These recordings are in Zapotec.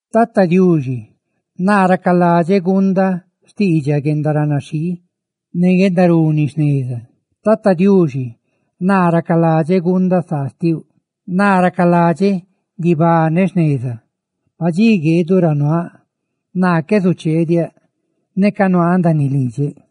Tata Diuxi, naa racaladxeꞌ guundaꞌ xtiidxaꞌ guendaranaxhii ne guendaruni jneza xtiuꞌ; Tata Diuxi, naa racaladxeꞌ guundaꞌ saa xtiuꞌ; naa racaladxeꞌ guibaneꞌ jneza. Padxí gueeduꞌ ra nuaaꞌ. Naa qué zucheediáꞌ neca nuaaꞌ ndaaniꞌ lidxeꞌ;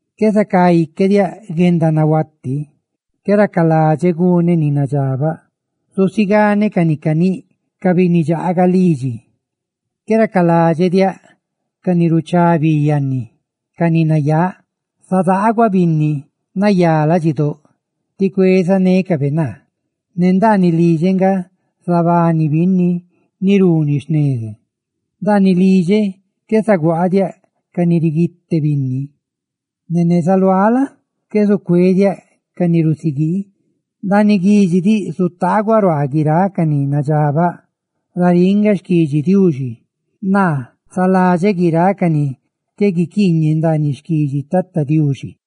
¡Qué zacá ique diaꞌ guendanahuati; qué racaladxeꞌ guneꞌ ni nadxabaꞌ! Zusiganeꞌ ca ni nagaꞌchiꞌ cananíꞌ ca binni dxaaga lidxi; ¡qué racaladxeꞌ diaꞌ ca ni ruchá bi yanni, ca ni nayáꞌ! Zadaaguaꞌ binni nayá ladxidóꞌ, tí cuezanécabe naa; ne ndaaniꞌ lidxeꞌ nga zabani binni si ni runi jneza. Ndaaniꞌ lidxeꞌ qué zaguaadiáꞌ ca ni riguite binni; ¡ne neza luáꞌ la? qué zucué diaꞌ ca ni rusiguii! Guiráꞌ dxi zutaaguaꞌ ruaa guiráꞌ ca ni nadxabaꞌ ndaaniꞌ guidxi diꞌ; ¡naa zaladxeꞌ guiráꞌ ca ni qué guiquiiñe ndaaniꞌ xquidxi Tata Diuxi!